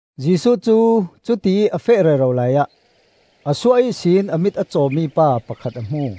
Jesuh cu cutiih a feh rero laiah a suah ihsin a mit a cawmi pa pakhat a hmu.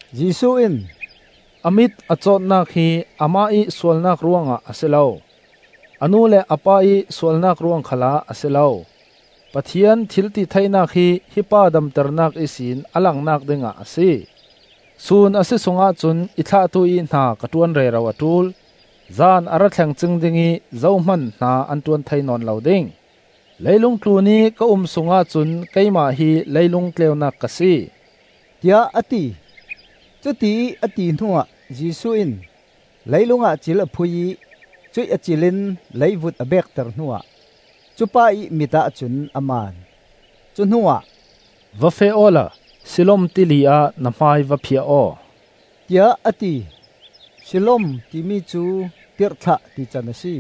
Jesuh in, “A mit a cawtnak hi amah ih sualnak ruangah a si lo, a nu le a pa ih sualnak ruang khalah a si lo. Pathian thil ti theinak hi hi pa damternak ihsin a langnak ding ah a si. Sun a si sung ahcun i thlahtu ih hna kan ṭuan rero a ṭul. Zan a ra thleng cing ding ih zohman hna an ṭuan thei nawn lo ding. Leilung tlunih ka um sungah cun keimah hi leilung tleunak ka si,” tiah a ti. Cutiih a ti hnuah Jesuh in leilungah cil a phui ih cuih a cil in leivut a beekter hnuah cu pa ih mit ahcun a man. Cu hnuah, “Va feh awla Siloam Tili ah na hmai va phiah aw,” tiah a ti. Siloam timi cu Tirhthlah tican a si.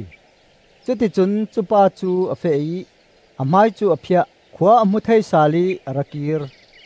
Cuti cun cupa cu a feh ih a hmai cu a phiah, khua a hmu thei sal ih a ra kir.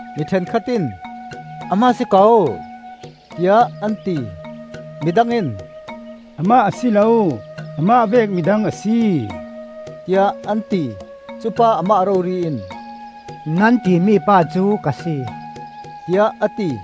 Mi ṭhenkhat in, “Amah a si ko,” tiah an ti. Midang in, “Amah a si lo; amah vek midang a si,” tiah an ti. Cupa amah rori in, “Nan timi pa cu ka si,” tiah a ti.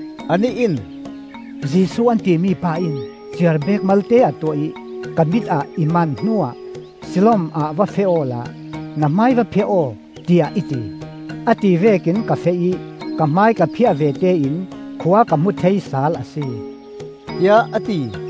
Anih in, “Jesuh an timi pa in ciarbek malte a tuah ih ka mit ah i man hnu ah Siloam ah va feh awla na hmai va phiah aw tiah i ti. A ti vekin ka feh ih ka hmai ka phiah vete in khua ka hmu thei sal a si,” tiah a ti.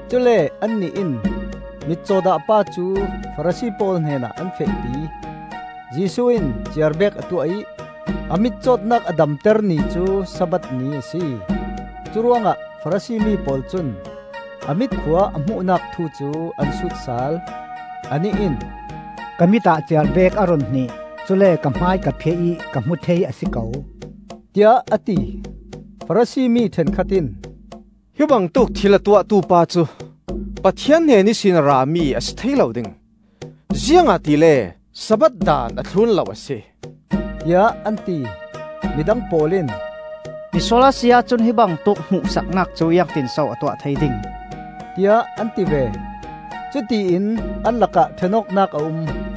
Cule annih in mitcaw dah pa cu Farasi pawl hnenah an fehpi. Jesuh in ciarbek a tuah ih a mitcawtnak a damter ni cu Sabbath ni a si. Curuangah Farasi mi pawl cun a mit khua a hmuhnak thu cu an sut sal. Anih in, “Ka mit ah ciarbek a run hnih, cule ka hmai ka phiah ih ka hmu thei a si ko,” tiah a ti. Farasi mi ṭhenkhat in, “Hi bangtuk thil a tuahtu pa cu Pathian hnen ihsin a rami a si thei lo ding, ziangahtile Sabbath daan a thlun lo a si,” tiah an ti. Midang pawl in, “Misual a si ahcun hi bangtuk hmuhsaknak cu ziangtinso a tuah thei ding?” tiah an ti ve. Cutiin an lakah ṭhenawknak a um.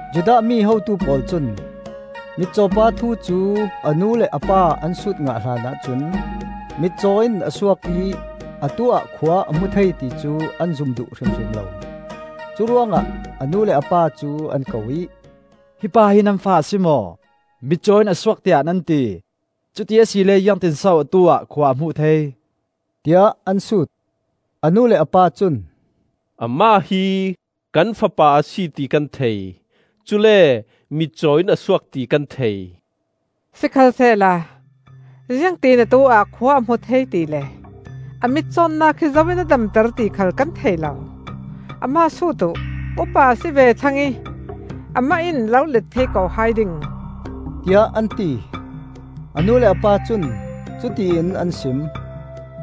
Judah mi hotu pawl cun mitcaw pa thu cu a nu le a pa an sut ngah hlanah cun mitcaw in a suak ih atu-ah khua a hmu thei ticu an zum duh hrimhrim lo. Curuangah a nu le a pa cu an ko ih, “Hi pa hi nan fa a si maw? Mitcaw in a suak tiah nan ti; cuti asile ziangtinso atu-ah khua a hmuh thei?” tiah an sut. A nu le a pa cun, “Amah hi kan fapa a si ti kan thei; cule mitcaw in a suak ti kan thei. Sikhalsehla ziangti in atu-ah khua a hmu thei ti le a mitcawtnak hi zo in a damter ti khal kan thei lo. Amah sut uh; upa a si ve thlang ih amah in a lo let thei ko hai ding,” tiah an ti. A nu le a pa cun cutiin an sim,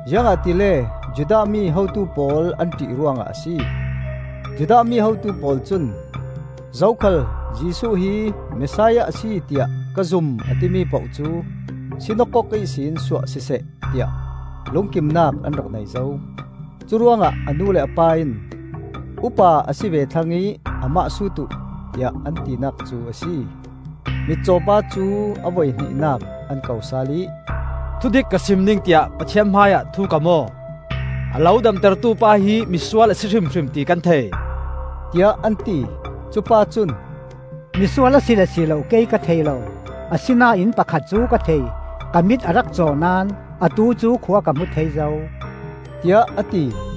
ziangahtile Judah mi hotu pawl an ṭih ruangah a si. Judah mi hotu pawl cun: zokhal Jesuh hi Messiah a si tiah ka zum a timi poh cu sinakok ihsin suah siseh, tiah lungkimnak an rak nei zo. Curuangah a nu le a pa in, “Upa a si ve thlang ih amah sut uh,” tiah an tinak cu a si. Mitcaw pa cu a voihnihnak an ko sal ih, “Thudik ka sim ding tiah Pathian hmaiah thu kam aw! A lo damtertu pa hi misual a si hrimhrim ti kan thei,” tiah an ti. Cupa cun, “Misual a si le si lo kei ka thei lo. Asinain pakhat cu ka thei: ka mit a rak caw naón atu cu khua ka hmu thei zo,” tiah a ti.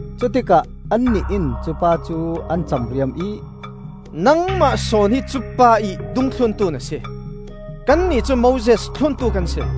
Cutikah annih in cupa cu an camriam ih, “Nangmah sawn hi cupa ih dungthluntu na si. Kannih cu Moses thluntu kan si.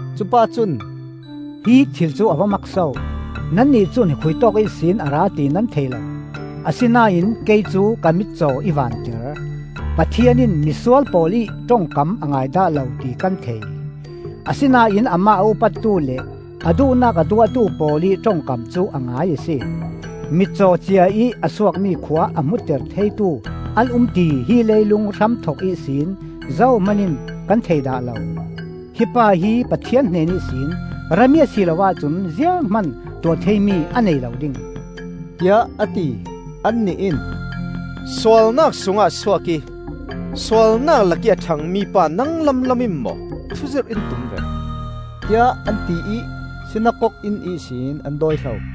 Cupa cun, “Hi thil cu a va mak so! Nannih cun khuitawk ihsin a ra ti nan thei lo, asinain kei cu ka mitcaw i vanter! Pathian in misual pawl ih ṭongkam a ngai dah lo ti kan thei; asinain amah a upattu le a duhnak a tuahtu pawl ih ṭongkam cu a ngai a si. Mitcaw ciaih a suakmi khua a hmuter theitu an um ti hi leilung hramthok ihsin zohman in kan thei dah lo. Hi pa hi Pathian hnen ihsin rami a si lo ahcun zianghman tuah theimi a nei lo ding,” tiah a ti. Annih in, “Sualnak sungah a suak ih sualnak lakih a ṭhang mi pa nang lamlam in maw thuzirh in tum ve?” tiah an ti ih sinakok inn ihsin an dawihlo.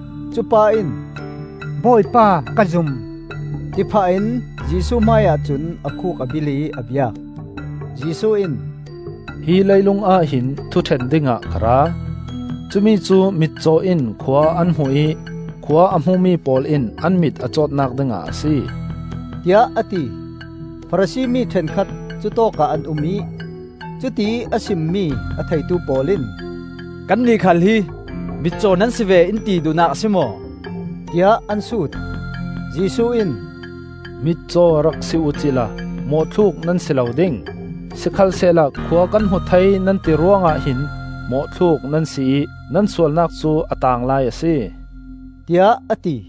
Cupa in, “Bawipa, ka zum!” ti phah in Jesuh hmaiah cun a khuk a bilh ih a biak. Jesuh in, “Hi leilungah hin thuṭhen dingah ka ra; cumicu mitcaw in khua an hmu ih khua a hmumi pawl in an mit a cawtnak dingah a si,” tiah a ti. Farasi mi ṭhenkhat cutawkah an um ih cutiih a simmi a theitu pawl in, “Kannih khal hi mitcaw nan si ve in ti duhnak a si maw?” tiah an sut. Jesuh in, “Mitcaw rak si uhcila mawhthluk nan si lo ding; sikhalsehla khua kan hmu thei nan ti ruangah hin mawhthluk nan si ih nan sualnak cu a taanglai a si,” tiah a ti.